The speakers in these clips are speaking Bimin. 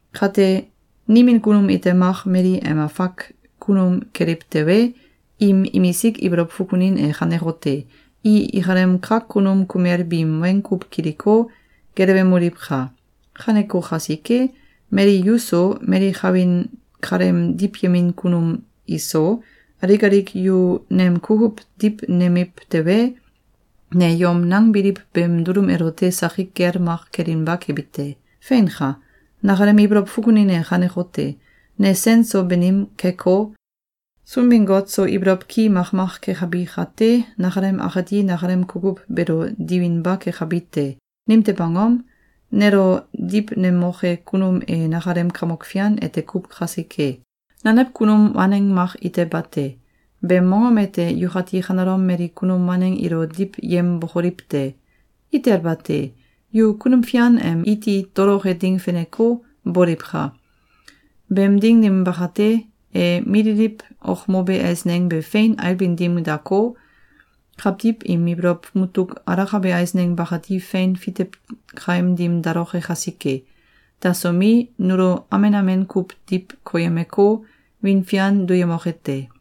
Kate, nimin kunum ite mak mali em afak kunum keliw tewe, im imisik ibolow fukunin e kanekote: I ikalem kak kunum kumel biim weng kuw kiliko, gelewemoliwka! Kaneko kasike, mali yu so, mali kawin kaleem diwyemin kunum iso, alik alik yu nem kukuw diwnemiw tewe, ne yom nangbiliw beem dulum elote sakik gel mak kelinba kebi te. Feinka! Nakalem ibolow fukunin e kanekote: Ne sen so banim keko, Sunbin-Got so ibolow ki makmak kekabi kate, nakalem akati nakalem kukuw beelo diwinba kekabi te. Nimtew angom? Nelo diwnemoke kunum e nakalem Kamok Fian ete kuw kasike. Nanew kunum waneng mak ite bate. Beem mongom ete yukati kanelom mali kunum waneng ilo diwyembokoliw te! Itel bate! Yu Kunum Fian em iti toloke ding feneko, boliwka! Beem ding dim bakate, e mililiw okmobe eisneng be fein ailbin dim dako, kawtiw im ibolow mutuk alakabe eisneng bakati fein fitew kaim dim daloke kasike. Dasomi, nulo amen amen kuw diw koyemeko, wiin fian duyemoke te.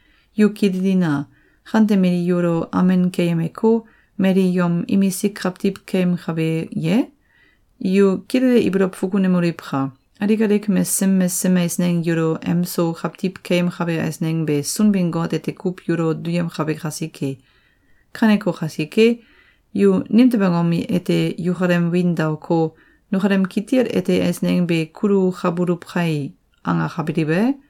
Yu kililina! Kante mali yulo amen keyemeko, mali yom imisik kawtiw keyemkabe ye? Yu kilele ibolow fukunemoliwka! Alik alik mesesem mesesem eisneng yulo em so kawtiw keyemkabe eisneng be Sunbin-Got ete kuw yulo duyemkabe kasike. Kaneko kasike, yu nimtew angom ete yukalem wiin daoko, “Nukalem kitil ete eisneng be kulukabuluw kai!”, angakabiliw e?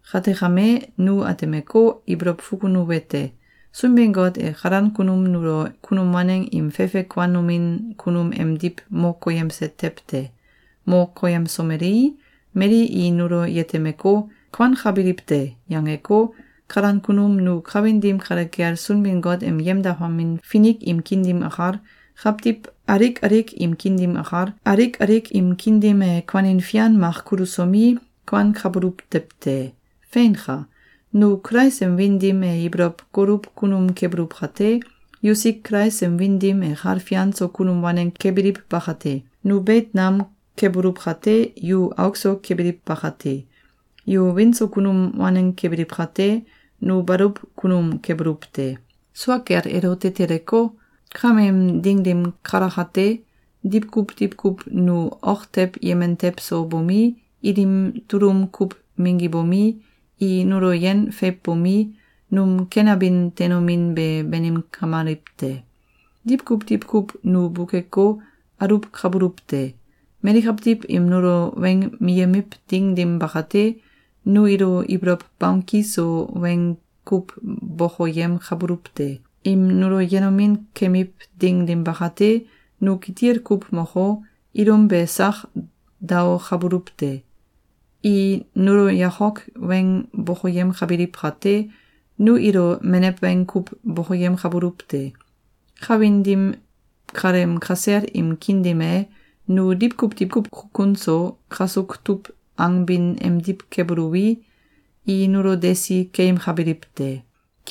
Kate kame, nu atemeko, ibolow fukunuwete: Sunbin-Got e kalan kunum nulo kunum waneng im fefe kuanomin kunum emdiw mo koyemse tew te. Mo koyemsomelei, mali i nulo yetemeko, “Kuankabiliw te!”, yangeko, kalan kunum nu kawin dim kale kel Sunbin-Got em yemdakamin finik im kiin dim akal, kawtiw alik alik im kiin dim akal, alik alik im kiin dim e kuanin fian mak kulusomi, kuankabuluw tew te. Feinka! Nu Kulais em wiin dim e ibolow goluw kunum kebuluw kate, yusik Kulais em wiin dim e kal fian so kunum waneng kebiliw bakate. Nu beit nam kebuluw kate, yu auk so kebiliw bakate. Yu wiin so kunum waneng kebiliw kate, nu baluw kunum kebuluw te. Sua kel elote teleko, kameem ding dim kalakate, diwkuw diwkuw nu ok tew yemen tew so bomi, ilim tulum kuw minggibomi, i nulo yen feiwbomi, num ken abin teinomin be banim kamaliw te. Diwkuw diwkuw nu bukeko, aluwkabuluw te. Mali kawtiw im nulo weng miyemiw ding dim bakate, nu ilo ibolow bamki so weng kuw bokoyemkabuluw te. Im nulo yenomin kemiw ding dim bakate, nu kitil kuw moko, ilum be sak daokabuluw te. I nulo yakok weng bokoyemkabiliw kate, nu ilo menew weng kuw bokoyemkabuluw te. Kawin dim kaleem kasel im kiin dim e, nu diwkuw diwkuw kukun so, kasuk tuw angbin emdiw kebuluwi, i nulo desi keyemkabiliw te.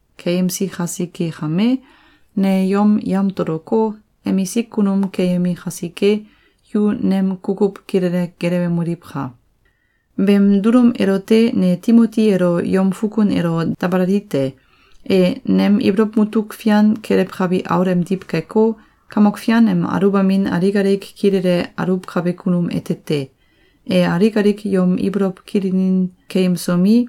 Keyemsi kasike kame, ne yom yamtoloko, emisik kunum keyemi kasike, yu nem kukuw kilele gelewemoliwka! Beem dulum elote ne Timoti elo yom fukun elo dabalali te. E nem ibolow mutuk fian kelewkabi aul emdiw keko, Kamok Fian em aluwbamin alik alik kilele aluwkabe kunum ete te. E alik alik yom ibolow kilinin keyemsomi,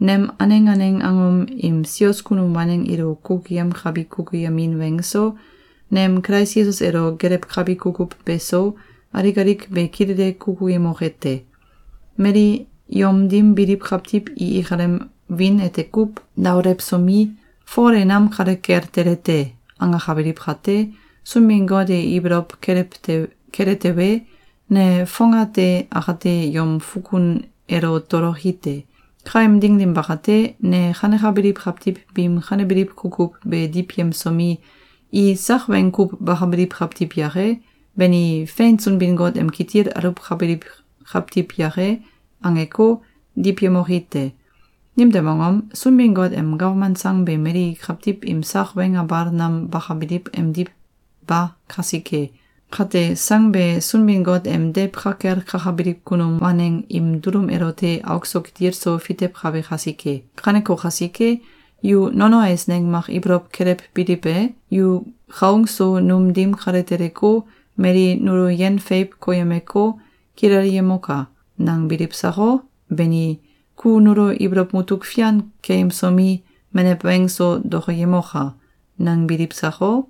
nem aneng aneng angom im sios kunum waneng ilo kukuyemkabi kukuyemin weng so, nem Kulais Yesus elo gelewkabi kukuw beso, alik alik be kilele kukuyemoke te. Mali yom dim biliw kawtiw i ikalem wiin ete kuw daolewsomi, “Fol e nam kale kel tele te!”, angakabiliw kate, Sunbin-Got e ibolow kele tewe, ne fongate akate yom fukun elo toloki te. Kaem ding dim bakate, ne kanekabiliw kawtiw biim kanebiliw kukuw be diwyemsomi, “I sak weng kuw bakabiliw kawtiw yake? Bani, fein Sunbin-Got em kitil aluwkabiliw kawtiw yake?”, angeko, diwyemoki te. Nimtew angom? Sunbin-Got em gawman sang be mali kawtiw im sak weng abal nam bakabiliw emdiw ba kasike. Kate, sang be Sunbin-Got em deiw ka kel kakabiliw kunum waneng im dulum elote auk so kitil so fitewkabe kasike. Kaneko kasike, yu nono eisneng mak ibolow kelewbiliw e? “Ku kaung so num dim kale teleko, mali nulo yen feiw koyemeko, kilelyemoka!”, nangbiliw sako? Beni, “Ku nulo ibolow mutuk fian keyemsomi, menew weng so dokoyemoka!”, nangbiliw sako?